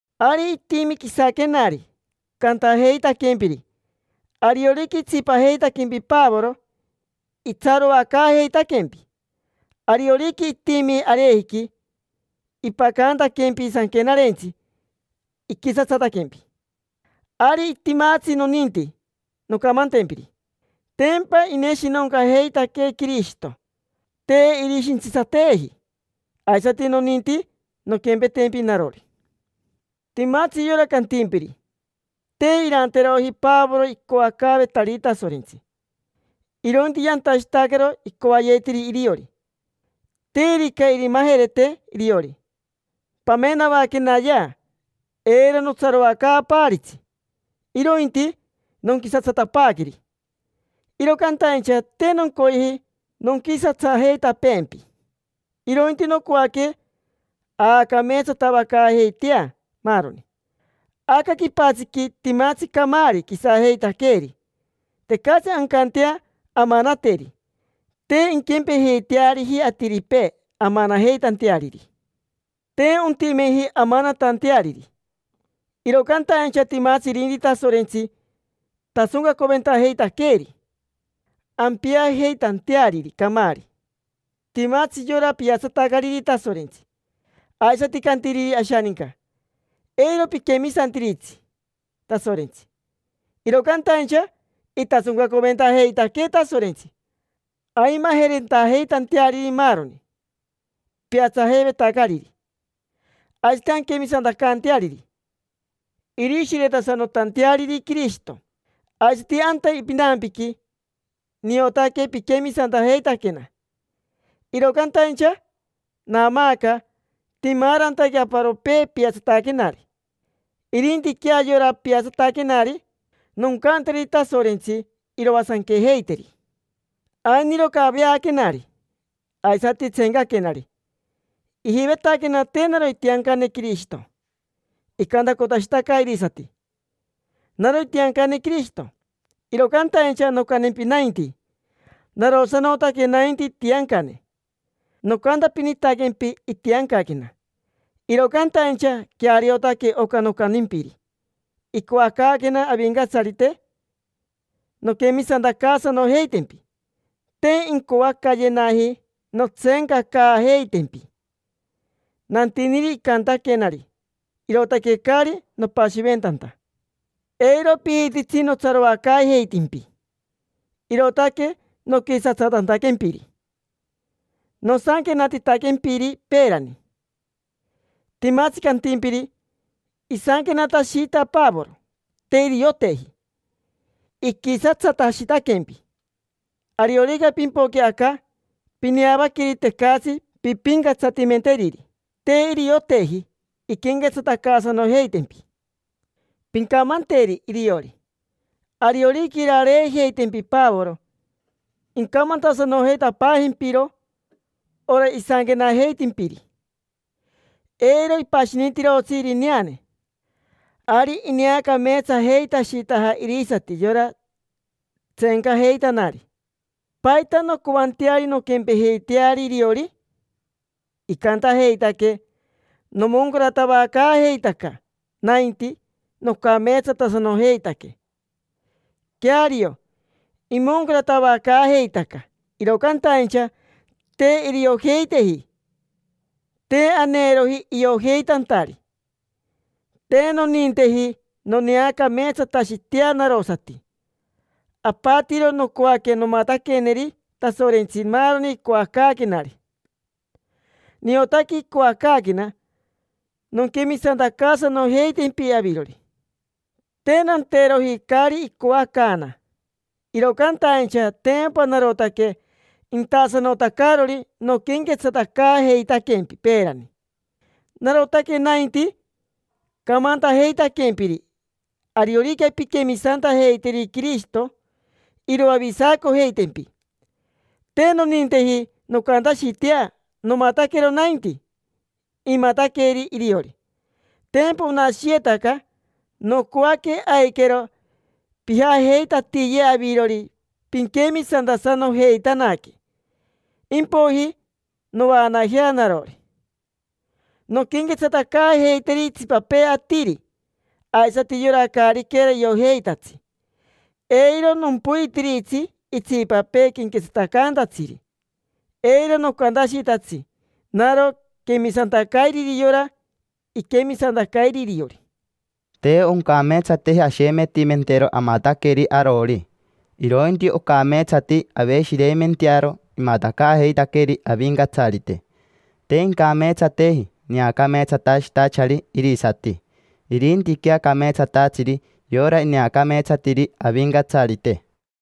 Ari itimi quisaquenari, cantajeitaquempiri: “Ariorica itsipajeitaquempi Pavoro, itsaroacaajeitaquempi. Ariorica itimi arejiqui ipacantaquempi sanquenarentsi, iquisatsataquempi”. Ari timatsi noninti noncamantempiri. Tempa ineshinoncajeitaquee Quirishito, te irishintsitsateeji: aisati noninti nonquempetempi narori. Timatsi yora cantimpiri: “Te iranteroji Pavoro icoacaavetariri Tasorentsi, irointi yantashitacaro icoayetiri iriori”. Terica irimajerete iriori, pamenavaquenayea eiro nontsaroacaapaaritsi, irointi nonquisatsatapaaqueri. Iro cantaincha te noncoyeji nonquisatsajeitapeempi, irointi nocoaque aacameetsatavacaajeitea maaroni. Aca quipatsiqui timatsi camaari quisajeitaqueeri: tecatsi ancantea amanateri; te inquempejeiteariji atiripee amanajeitanteariri. Te ontimeji amanatanteariri, iro cantaincha timatsi irinti Tasorentsi tasoncacoventajeitaqueeri ampiajeitanteariri camaari. Timatsi yora piatsatacariri Tasorentsi, aisati cantiriri ashaninca: “Eiro piquemisantiritsi Tasorentsi”. Iro cantaincha itasoncacoventajeitaquee Tasorentsi aimajerentajeitanteariri maaroni piatsajeivetacariri, aisati anquemisantacanteariri, irishiretasanotanteariri Quirishito. Aisati anta pinampiqui, niotaque piquemisantajeitaquena, iro cantaincha naamaaca itimaarantaque aparopee piatsataquenari. Irintiquea yora piatsataquenari, noncanteri Tasorentsi iroasanquejeiteri. Ainiro caveaquenari, aisati tseencaquenari. Ijivetaquena te naro itiancane Quirishito. Icantacotashitaca irisati: “Naro itiancane Quirishito”, iro cantaincha noncantempi nainti: narosanotaque nainti itiancane. Nocantapinitaquempi itiancaquena, iro cantaincha queariotaque oca nocantimpiri. Icoacaaquena Avincatsarite nonquemisantacaasanojeitempi: te incoacayenaji nontseencacaajeitempi. Nantiniri icantaquenari, irootaque caari nopashiventanta. Eiro pijititsi notsaroacaajeitimpi, irootaque noquisatsatantaquempiri nosanquenatitaquempiri peerani. Timatsi cantimpiri: “Isanquenatashita Pavoro, te irioteji. Iquisatsatashitaquempi. Ariorica impoque aca, pineavaqueri tecatsi pimpincatsatimenteriri. Te irioteji inquenquetsatacaasanojeitempi”. Pincamanteri iriori: “Ariorica irareejeitempi Pavoro, incamantasanotapaajempiro oca isanquenajeitimpiri. Eiro ipashinitirotsi irineane”. Ari ineacameetsajeitashitaja irisati yora tseencajeitanari. ¿Paita noncoanteari nonquempejeiteari iriori? Icantajeitaque: “Nomoncaratavacaajeitaca nainti, nocameetsatasanojeitaque”. Queario, imoncaratavacaajeitaca, iro cantaincha te iriojeiteji, te aneeroji iojeitantari. Te noninteji noneacameetsatashitea narosati: apatiro nocoaque nomataqueneri Tasorentsi maaroni icoacaaquenari. Niotaque icoacaaquena nonquemisantacaasanojeitempi avirori. Te nanteroji caari icoacaana, iro cantaincha tempa narotaque intasanotacarori noquenquetsatacaajeitaquempi peerani. Narotaque nainti camantajeitaquempiri ariorica pinquemisantajeiteri Quirishito, iroavisacojeitempi. Te noninteji noncantashitea nomataquero nainti imataqueri iriori: tempa onashiyetaca. Nocoaque aiquero pijajeitatiye avirori pinquemisantasanojeitanaque. Impoiji novaanajea narori, nonquenquetsatacaajeiteri itsipapee atiri aisati, yora caariquera iojeitatsi. Eiro nompoitiritsi itsipapee quenquetsatacantatsiri, eiro nocantashitatsi naro quemisantacairiri yora iquemisantacairi iriori. Te oncameetsateji ashemetimentero amataqueri arori, irointi ocameetsati aveshireimentearo imatacaajeitaqueeri Avincatsarite. Te incameetsateji neacameetsatashitachari irisati, irintiquea cameetsatatsiri yora ineacameetsatiri Avincatsarite.